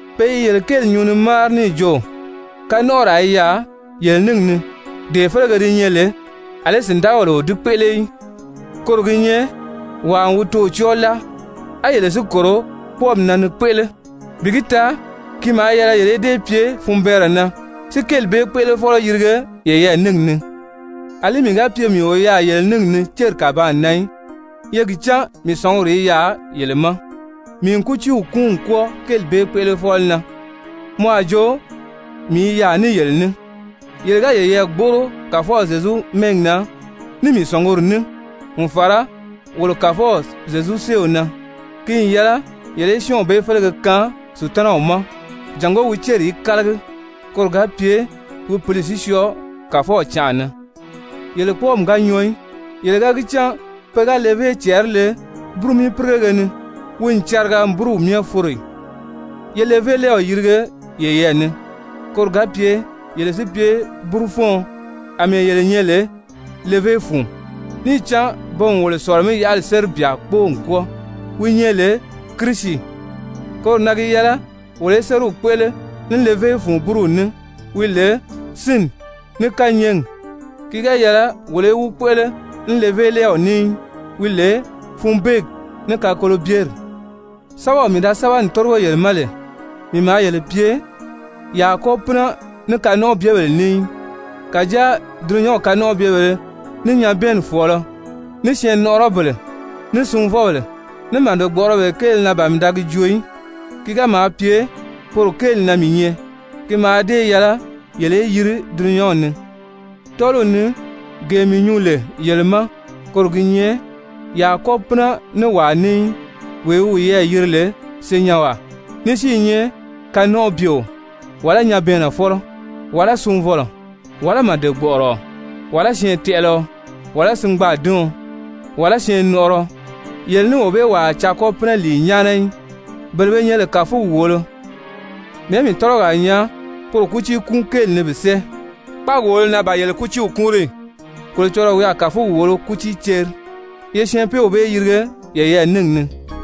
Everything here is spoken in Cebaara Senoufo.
Pe i yele kéeli nyuu ni máari níì jo, kanɔnʔɔraa i yaà yele níngi ni, dee félege di nyɛ lè àlí sìndagabèle o di kpéʔele í. Koro gi nyɛ wàa n wi toò cɔ́ɔ láa. A yele si kòro kpɔ́ɔmi na ni kpéʔele! Bi gi taa ki maa yɛlɛ yele í dée pye funbɛɛnrɛ na si kéeli bee kpéʔelefɔlɔ yirige yeyɛɛ níngi ni! Alí mii ga pye mii o yaà yele níngi ni céri kàbaan na í, ye gi cán mii sɔ̀nguri i yaà yele ma, mii n kútiiw kúun n kwɔ́ɔ kéeli bee kpéʔelefɔlɔ na, mɔ a jo mii i yaà ní yele ní. Yele ga yeyɛɛ gbóʔoro Kàfɔw Zyezu mɛ́ɛgi na, ní mii sɔ̀nguri ní n fàra wolo Kàfɔw Zyezu séew na, ki n yɛlɛ yele í syɔ́ɔnw bee félege kaan Sutanaw ma, jàngó wi céri í kálagi koro ga pye wi pǐli si syɔɔ Kàfɔw canʔa na. Yele kpɔ́ɔmi ga nyɔɔ í! Yele ga cán pe ga levé cɛɛri le búrumii-pírigege ni, wi n cariga n búruw myɛ foro ì? Ye levélɛɛw yirige yeyɛɛ ni, koro ga pye yele si pye búrufɔ́ɔn, àmɛɛ yele nyɛ lè levé fun, níì cán pe n wolo sɔ̀lɔ-mí-yaʔali séri byà kpóo n kwɔ́ɔ wi nyɛ lè Kirisi. Koro na gi yɛlɛ wolo í sériw kpéʔele ní levé fun búruw ní wi lè sínni ní kányɛɛgi, ki ga yɛlɛ wolo í wi kpéʔele ní levélɛɛw ní í wi lè funbeegi ní kakolobyeri. Sɛ́bɛw mii da sɛ́bɛ n tórigo yele ma lè, mii maa yele pye ye a kɔ́ pínɛ ní kanɔnʔɔbyebèlē ní í. Kàjáa dulunyanw kanɔnʔɔbyebèlē, ní nyabɛɛnni fɔ̀ɔlɔ, ní syɛɛnnɔʔɔrɔbèle, ní sunvɔbèle, ní màde-gbɔ̀ʔɔrɔbèle kéele na ban mii da gi joo í. Ki ga maa pye poro kéeli na mii nyɛ, ki mǎà dée yɛlɛ yele í yiri dulunyanw ni. Tɔ́ɔliw ni gee mii nyuu lè yele ma, koro gi nyɛ ye a kɔ́ pínɛ ní wàa ní í wee wi wiyɛɛ yiri lè senyɛnwaa ní si i nyɛ kanɔnʔɔbyeo, wàlá nyabɛɛnnɛfɔlɔ, wàlá sunvɔlɔ, wàlá màde-gbɔ̀ʔɔrɔɔ, wàlá syɛɛntɛʔɛlɛɔ, wàlá singbaadiɔn, wàlá syɛɛnnɔʔɔrɔɔ, yele ní wee bee wàa a caa kɔ́ pínɛ lìi nyáana í. Bele be nyɛ lè kàfugi wòolo, mɛ̀ɛ́ mii tɔ́lɔgi a nyaa poro kútii kúun kéeli ni bi sɛ́ɛ? Kpáagi wòolo na ban yele kútiiw kúunri ì? Kolocɔlɔɔ wi a kàfugi wòolo kútii ceri. Ye syɛɛnpeew bee yirige yeyɛɛ níngi ni.